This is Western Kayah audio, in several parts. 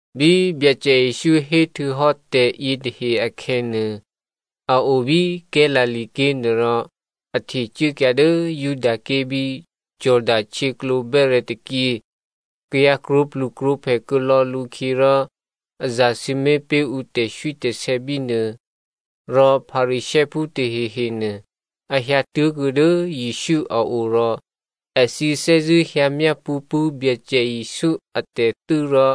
Bí Byacè Jesǔ hé htuô̌hò́ tè̤yě tahe akhè̌nuô, a o bí Galilea ké̤ nuôrò a htecuốkyǎ dố Judaké̤ bí Jordano htyěklǒ bè́rè̤̌ tôkyě. Kayǎ krwǒplukrwǒphè kuô̌lò̌ lǔkhyě rò a zasǐmé̤ pé̤ ǔ tè̤swítè̤sè̌ bínuô. Rò Pharisěophú tahehenuô a hyǎ tố̤kuô̌ dố Jesǔ a o rò èthǐ thè́zṳ̂́ hyǎ myápṳ̌ pṳ̂́ Byacè Jesǔ atè̤thû́ rò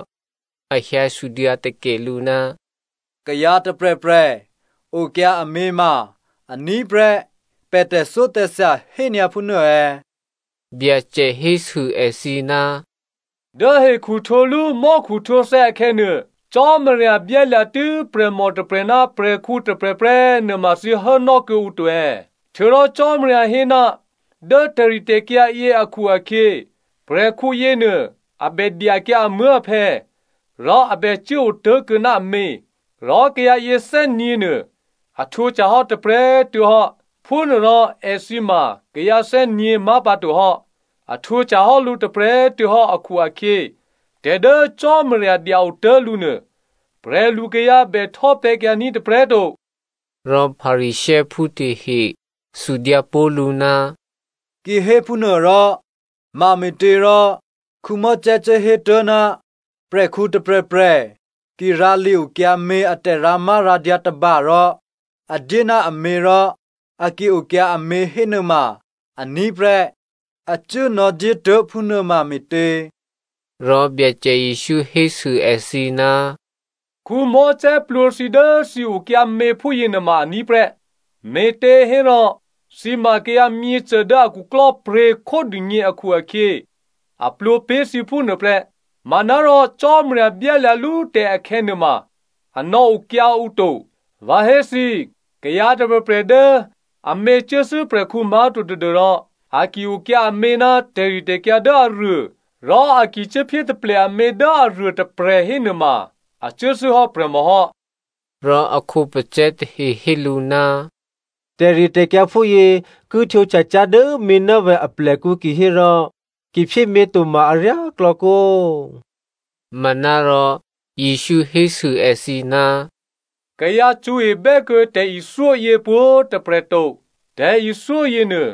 a hyǎ sudyǎ takè lǔ, “Kayǎ tôprè̤prè̤ okyǎ amě ma aní̤ prè́ pè̤ tè̤thyótè̤thya hényǎ phúnuô è̌?” Byacè hésû èthǐ, “Dố hekhuhtwǒlú mò́khuhtwǒthè̌ akhè̌nuô, ‘Cò́marya byálya̤tû́ prè̤mò tôprè̤ ná prè̤khǔ tôprè̤ prè́,’ nuôma thǐ hốnò́ kuô̌ǔ to è̌? Htuô̌rò Cò́marya hé, ‘Dố tè̤ritè̤kyǎ yě akhu-akhyě prè̤khǔ yěnuô a bè dyakyǎ amuố̤aphè̌ rò a bè cuố otố̤kuô̌ ná amě, rò kayǎ yěthè́nyě̤nuô a htwǒhtyahò́ tôprè̤꤮ tuô̌hò́.’ Phúnuôrò èthǐ ma kayǎ thè́gně má̤pǎtohò́. A htwǒhtyahò́ lǔ tôprè̤꤮ tuô̌hò́ akhu-akhyě, tè̤ dố Cò́marya dya otố̤ lǔ nuô, prè̤lukayǎ bè htò́pè̤̌kyǎní̤ tôprè̤꤮ to.” Rò Pharisěophú tahe sudyǎ pó̤ lǔ, “Kihéphúnuôrò, mame̤těrò Mosè cuố hétuố̤ ná prè̤khǔ tôprè̤prè̤ ki rǎ li-okyǎmě a tè̤rǎmárǎdyǎ tôba rò a dyé ná amě rò a ki okyǎ amě hénuôma aní̤ prè́, a cuố nò̌dyétuố̤ phúnuôma me̤tě?” Rò Byacè Jesǔ hésû èthǐ, “Mosè plwǒ thǐ dố thǐ okyǎ mě phúyěnuôma aní̤ prè́, me̤těhérò thǐ ma kayǎ myěcô dố a khuklò́pryě̤ khódûgně akhu-akhyě a plwǒ pé̤ thǐ phúnuô prè́. Manárò Cò́marya byálya̤lú tè̤ akhè̌ nuôma a nò̌okyǎ ǔ to. Vǎ hé thǐ, kayǎ tôprè̤prè̤ dố amě cuốthû́ prè̤khǔ má̤to tadû́rò a ki okyǎ amě ná tè̤ritè̤kyǎ dố aruô rò a ki cuốphyé taple amě dố aruôtôprè̤ hénuôma a cuốthû́hò́ prè̤mòhò́.” Rò a khǒpacè̤̌ tahe hé lǔ, “Tè̤ritè̤kyǎ phúyě ki htwǒhtya cyá̤ dố měnávè̤ aplèkǔ kihérò ki phyémě to ma aryáklò̌ kǒ?” Manárò Jesǔ hésû èthǐ, “Kayǎ cṳ̌ebè́ kuô̌ tè̤ithyó yě pwǒ̤꤮ tôprè̤ to. Tè̤ithyó yěnuô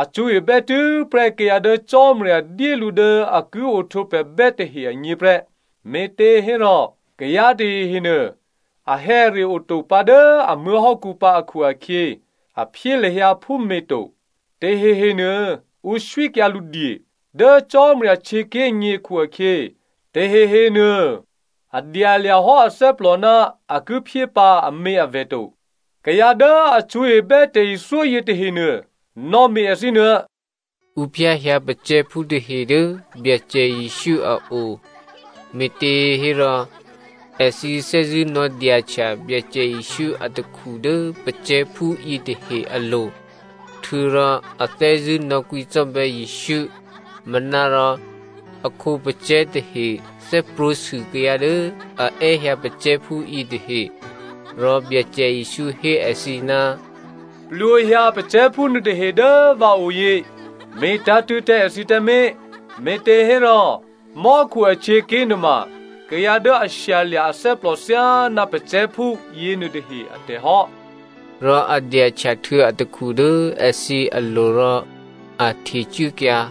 a cṳ̌ebè́ tû́prè́ kayǎ dố Cò́marya dyé lǔ dố a ki ohtwǒprè̤bè́ tahe agně prè́. Me̤těhérò kayǎ tahehe nuô, ahè̌are oto pǎ dố a muố̤hò́kǔ pǎ akhu-akhyě, a phyé lahyǎ phúmě to. Tahehe nuô ǔ swíkyǎ lǔdye. Dố Cò́marya htyěké̤gně akhu-akhyě tahehe nuô a dyalya̤ hò́ athè́plò ná a ki phyé pǎ aměavè̤ to. Kayǎ dố a cṳ̌ebè́ tè̤ithyó yětahenuô, nò̌me̤ èthǐ nuô.” Ǔ phyáhyǎ pacè̤̌phú tahe dố Byacè Jesǔ a o, me̤těhérò èthǐ thè́zṳ̂́ nò̌dyahtya Byacè Jesǔ atakhu dố pacè̤̌phú yětahe alo̤ htuô̌rò a thè́zṳ̂́ nò̌kwǐcò́bè̌ Jesǔ. Manárò a khǒpacè̤̌ tahe thè́prwǒ̤sû kayǎ dố a è́hyǎ pacè̤̌phú yětahe. Rò Byacè Jesǔ hé èthǐ, “Plwǒhyǎ pacè̤̌phú nuôtahe dố vǎoyě, me̤tǎ̤tṳ̂̌ tǎ èthǐ tǎmé̤, me̤těhérò mò́khu ahtyěaké̤ nuôma kayǎ dố a shyalya̤ athè́plò thyáná pacè̤̌phú yěnuôtahe atè̤hò́.” Rò a dyahtyahtuô̌ atakhu dố èthǐ alo̤ rò a htecuốkyǎ.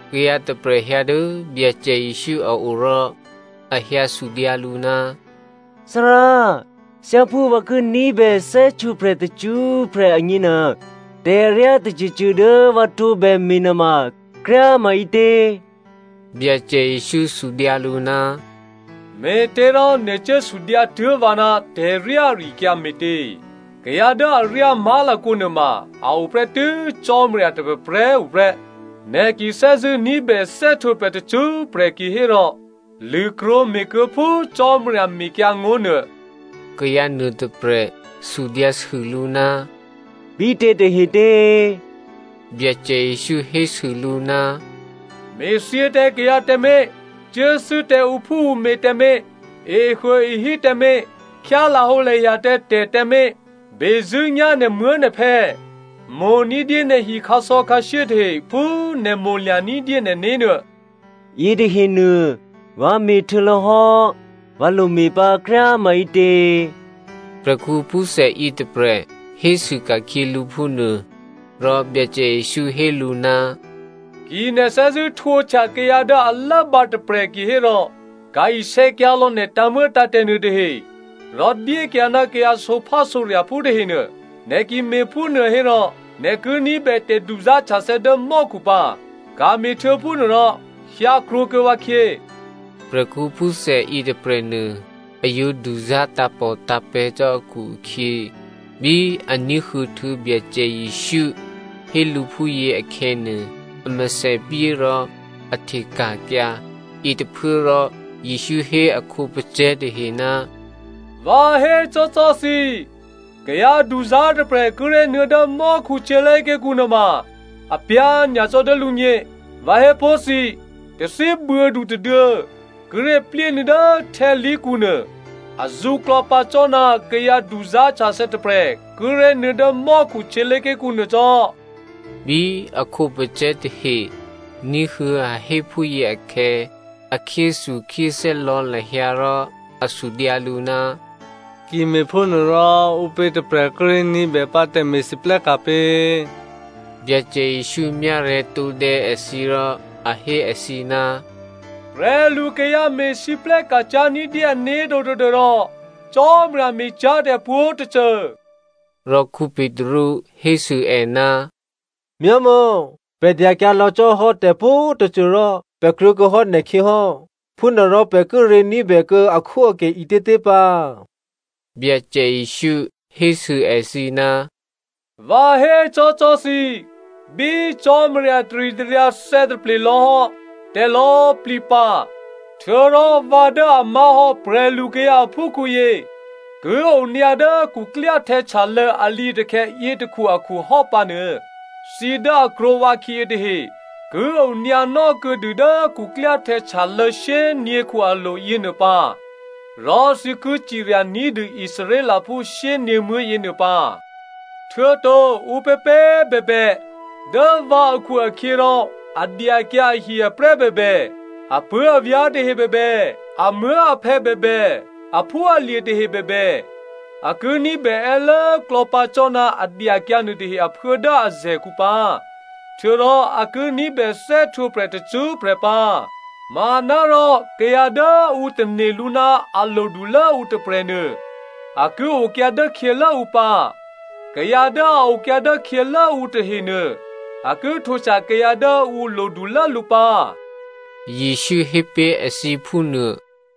Kayǎ tôprè̤ hyǎ dố Byacè Jesǔ a o rò a hyǎ sudyǎ lǔ, “Thárá, thyáphú vǎ ki ní̤bè thè́htwǒprè̤ tacṳ́prè̤ agněnuô, tè̤ aryá tôcôcô dố vǎ tǒbè me̤nuôma kryá꤮ maǐtě?” Byacè Jesǔ sudyǎ lǔ, “Me̤těrò nè̤ cuố sudyǎtuố̤ vǎ ná tè̤ryá ari-akyǎ me̤tě? Kayǎ dố aryá má̤lakǒ nuôma a o prè́tû́ Cò́marya tôprè̤prè̤꤮ tuô̌ prè́. Nè̤ ki thè́zṳ̂́ ní̤bè thè́htwǒprè̤ tacṳ́prè̤ kihérò lṳ̂krwǒ me̤kuô̌ phú Cò́marya mekyǎngó̤ nuô.” Kayǎ nuôtôprè̤ sudyǎsû lǔ, “Bítě tahetě?” Byacè Jesǔ hésû lǔ, “‘Me̤thyě tǎ kayǎ tǎmé̤, cuốthû́ tǎ ǔphúǔmě tǎmé̤, ehuôehí tǎmé̤, khyá lahǒlahya tǎ tè̤ tǎmé̤. Bezṳ̂́nyá̤ nè̤muố̤nè̤phè̌, mo̤ ní̤dyé nè̤hi khǎsò̌khǎshyé tahe phú nè̤ mo̤lya̤ ní̤dyé nè̤né̤ nuô.’” “Yětahenuô vǎ me̤htuô̌lò̌hò́. Vǎ lome̤pǎ kryá꤮ maǐtě?” Prè̤khǔ phúthè yětôprè̤ hésû ka̤khyě lǔ phúnuô. Rò Byacè Jesǔ hé lǔ, “Ki nè̤ thè́zṳ̂́ htwǒhtya kayǎ dố a lốbǎ tôprè̤ kihérò ka̤ isè̌kyǎlò̌ nè̤ tǎ̤muô̌tǎ̤tè̤ nuôtahe rò dyékyǎ ná kayǎ sǒphásǒrya̤phú tahenuô. Nè̤ ki me̤phúnuô hérò nè̤ ki ní̤bè tè̤duzá̤htyathè̌ dố mò́khu pǎ. Ka̤me̤htuô̌ phúnuô rò hyǎ krwǒkuô̌ vǎkhyě.” Prè̤khǔ phúthè yětôprè̤nuô, a yǒ duzá̤ tǎ̤pòtǎ̤pè̤̌ cò́ akhu-akhyě, bí a ní̤huô̌ htuô̌ Byacè Jesǔ hé lǔ phúyě akhè̌nuô, a mèthèpyé rò a hteka̤kyǎ. Yětôphuốrò Jesǔ hé a khǒpacè̤̌ tahe, “Vǎ hécò́cò́ thǐ, kayǎ duzá̤ tôprè̤ kíré̤ nuô̌ dố mò́khu htyělé̤ké̤kǔ nuôma, apyá̤ nyacò́ dố lǔgně. Vǎ hé pó̤ thǐ꤮, tathíbuô̌du tôduô̌ kíré̤ plyénuô̌ dố htè́khǎlí̤kǔnuô azǔ klò̌pǎ cò́ ná kayǎ duzá̤htyathè̌ tôprè̤ kíré̤ nuô̌ dố mò́khu htyělé̤ké̤kǔ nuô cò́.” Bí a khǒpacè̤̌ tahe ní̤huô̌ a hé phúyě akhè̌, a khyéthukhyéthè́ lò̌ lahyǎ rò a sudyǎ lǔ, “Ki me̤phúnuôrò ǔpě tôprè̤ kíré̤ ní̤bèpǎ tè̤me̤lwóhteka̤ pě?” Byacè Jesǔ myárè̤̌ tǒdè̌ èthǐ rò a hé èthǐ, “Prè̤lukayǎ me̤lwóhteka̤ cyá̤ ní̤dyé ané̤to tadû́rò Cò́marya me̤cyá̤tè̤ pwǒ̤tôcô.” Rò Petru hésû è, “Myámò̌, pè̤ dyakyǎ lò̌ cò́hò́ tè̤pwǒ̤꤮ tôcô rò pè̤ krwǒkuô̌hò́ nè̤khyěhò́. Phúnuôrò pè̤ kíré̤ ní̤bè kuô̌ akhwóakè ǐtětě pǎ?” Byacè Jesǔ hésû èthǐ, “Vǎ hécò́cò́ thǐ꤮, bí Cò́marya taritaryǎ thè̌taple lò̌hò́ tè̤lò̌꤮ plǐ pǎ, htuô̌rò vǎ dố a má̤hò́ prè̤lukayǎ aphúkhǔyě ki onyǎ dố khuklyáhtè̌ htyalô̌ alǐatakhè̌ yětôkhu akhu hò́pǎnuô, thǐ dố a krwǒ vǎkhyě yětahe ki onyǎnò́ kuô̌dû dố khuklyáhtè̌ htyalô̌ shyényě̤khu alo̤ yěnuô pǎ rò thǐ ki cirya ní̤dû Israelphú shyényě̤muố̤ yěnuô pǎ. Htuô̌to ǔpěpě꤮ bèbè, dố vǎ akhu-akhyěrò a dyakyǎ ahi-aprè́ bèbè, apuố̤avyá̤ tahe bèbè, amuố̤aphè̌ bèbè, aphúalye̤ tahe bèbè, a ki ní̤bè è́lốklò̌ pǎ cò́ ná a dyakyǎ nuôtahe aphuố dố azè̤kǔ pǎ, htuô̌rò a ki ní̤bè thè́htwǒprè̤ tacṳ́prè̤ pǎ. Manárò kayǎ dố ǔ tane̤ lǔ ná a lodulố ǔ tôprè̤nuô, a ki okyǎ dốkhyělố ǔ pǎ, kayǎ dố a okyǎ dốkhyělố ǔ tahenuô a ki htwǒhtya kayǎ dố ǔ lodulố lǔ pǎ,” Jesǔ hé pé̤ èthǐ phú nuô.